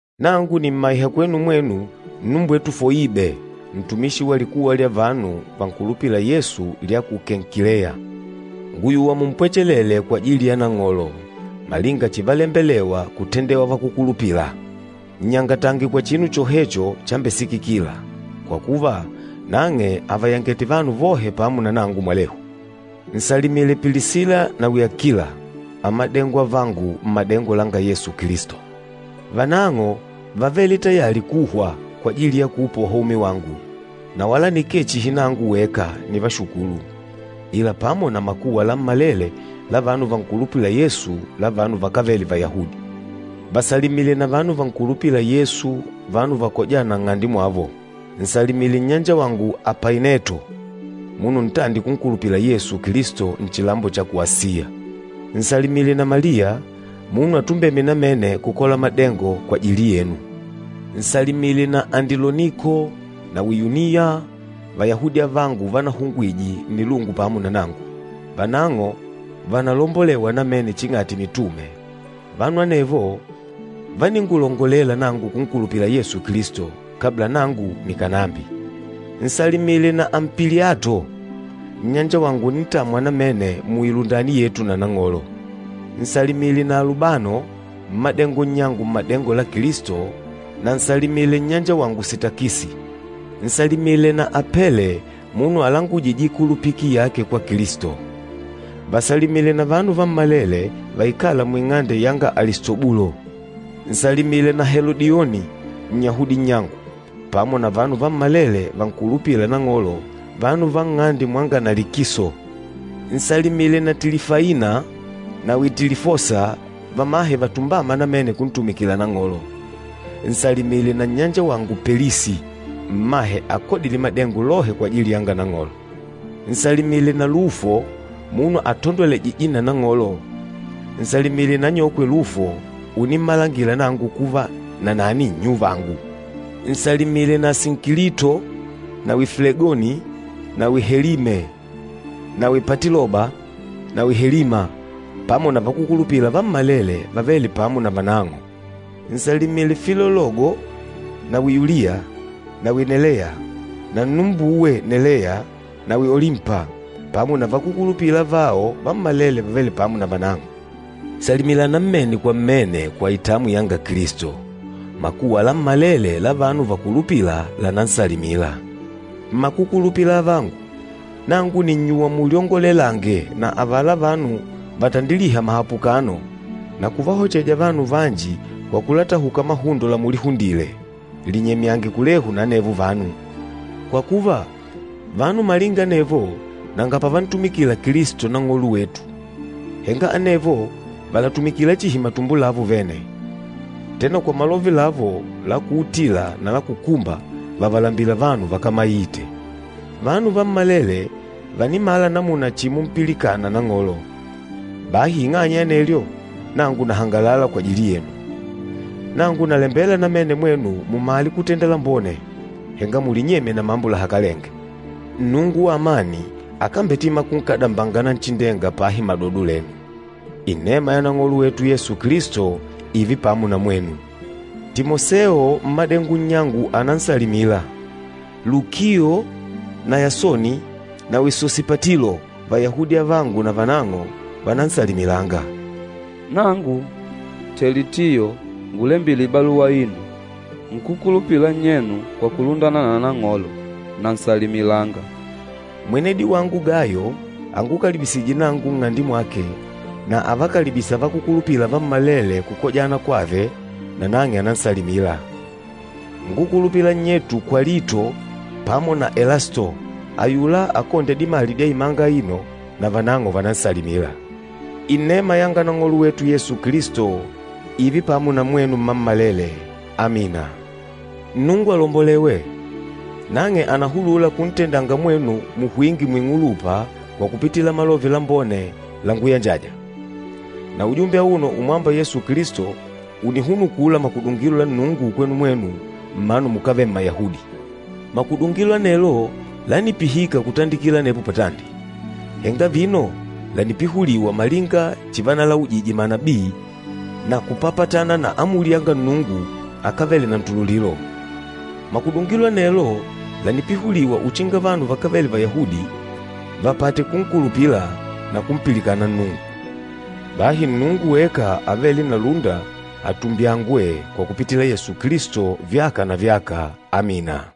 Nangu nìmmaiha kwenu mwenu, nnumbwetu Foibe ntumishi wa likuwa lya vanu vankulupîla Yesu lya ku Kenkileya. Ngùyuwa mumpwechelele kwajili ya Nang'olo, malinga chivalembelewa kutendewa vakúkulupila. Nnyangatange kwa chinu chohecho chambesikikila, kwa kuva, nang'e àvayangete vanu vohe pamo na nangu mwalehu. Nsalimile Pilisila nawi Akila, amadengo avangu mmadengo langa Yesu Kilisto. Vanang'o vávele tayali kuhwa kwajili ya kuupoha umi wangu, na wala nikee chihi nangu weka nivashukûlu, ila pamo na makuwa lammalele la vanu vankulupîla Yesu, la vanu vakávele Vayahudi. Vasalimile na vanu vankulupîla Yesu, vanu vakojâna nng'ande mwavo. Nsalimile nnyanjawagu Apaineto, munu ntandi kunkulupila Yesu Kilisto nchilambo cha ku Asiya. Nsalimile na Maliya, munu atumbême namene kukola madengo kwajili yenu. Nsalimile na Andiloniko nawi Yuniya Vayahudi avangu vanahungwije nnilungu pamo na nangu. Vanang'o vànalombolewa namene ching'ati mitume, vanu anevo váningulongolela nangu kunkulupila Yesu Kilisto, kabla nangu nikànambi. Nsalimile na Ampiliato, nnyanjawangu unintamwa namene muilundani yetu na Nang'olo. Nsalimile na Alubano, mmadengo nnyangu mmadengo la Kilisto, na nsalimile nnyanjawangu Sitakisi. Nsalimile na Apele munu alangujîje ikulupiki yake kwa Kilisto. Vasalimile na vanu vammalele vaikâla muing'ande yanga Alistobulo. Nsalimile na Helodioni Nnyahudi nnyangu, pamo na vanu vammalele vankulupîla Nang'olo, vanu va nng'ande mwanga Nalikiso. Nsalimile na Tilifaina nawi Tilifosa vamahe vatumbâma namene kuntumikila Nang'olo. Nsalimile na nnyanjawangu Pelisi, mmahe akodîle madengo lohe kwajili yanga Nang'olo. Nsalimile na Lufo, munu atandolwejîje na Nang'olo, nsalimile na anyokwe Lufo unimmalangila nangu kuva, nanani nnyuvangu. Nsalimile na Asinkilito nawi Flegoni nawi Helime nawi Patiloba nawi Helima, pamo na vakúkulupila vammalele vavêle pamo na vanang'o. Nsalimile Filologo nawi Yulia nawi Neleya na nnumbuwe Neleya nawi Olimpa, pamo na vakúkulupila avao vammalele vavêle pamo na vanang'o. Salimilana mmene kwa mmene kwa itamwi yanga Kilisto. Makuwa lammalele la vanu vakulupîla lànansalimila. Mmakukulupila avangu, nangu nìnnyuwa mulyongolelange na avala vanu vatandilîha mahapukano na kuvahocheja vanu vanji kwa kulatahuka mahundo lamulihundile. Linyemyange kulehu na anevo vanu. Kwa kuva, vanu malinga anevo nanga pavantumikila Kilisto Nang'olo wetu, henga anevo vàlatumikila chihi matumbo lavo vene. Tena kwa malove lavo la kuutila na la kukumba, vàvalambila vanu vakámaite. Vanu vammalele vànimala namuna chimumpilikana Nang'olo, bahi ing'anya ya anelyo nangu nahangalala kwajili yenu. Nangu nalembela namene mwenu mumale kutenda lambone, henga mulinyemye na mambo lahakalenge. Nnungu wa amani akambetima kunkadambanga Nanchindenga pahi madodo lenu. Inema ya Nang'olo wetu Yesu Kilisto ììve pamo na mwenu. Timoseo, mmadengo nnyangu ànansalimila. Lukio na Yasoni nawi Sosipatilo Vayahudi avangu navanang'o vànansalimilanga. Nangu Telitiyo ngulembîle baluwa aino, nkúkulupila nnyenu kwa kulundana na Nang'olo, nansalimilanga. Mwenedi wangu Gayo angukalibisîje nangu nng'ande mwake, na avakalibîsa vakúkulupila vammalele kukojana kwave, nanang'e ànansalimila. Nkúkulupila nnyetu Kwalito pamo na Elasto ayula akôndya dimali dya imanga aino, navanang'o vànansalimila. [Inema yanga Nang'olo wetu Yesu Kilisto ììve pamo na mwenu mmammalele. Amina.] Nnungu alombolewe! Nang'e ànahulula kuntendanga mwenu muhwinge muing'ulupa kwa kupitila Malove Lambone languyanjaja. Na ujumbe auno umwâmba Yesu Kilisto, ùnihunukula makudungilo la Nnungu kwenu mwenu mmanu mukávele Mmayahudi. Makudungilo anelo lánipihika kutandikila anepo patandi, henga vino lànipihuliwa malinga chivanalaujije manabii na kupapatana na amuli yanga Nnungu akávele na ntululilo. Makudungilo anelo lànipihuliwa uchinga vanu vakávele Vayahudi vapate kunkulupila na kumpilikana Nnungu. Bahi Nnungu weka avêle na lúnda, atumbyangwe kwa kupitila Yesu Kilisto vyaka na vyaka! Amina.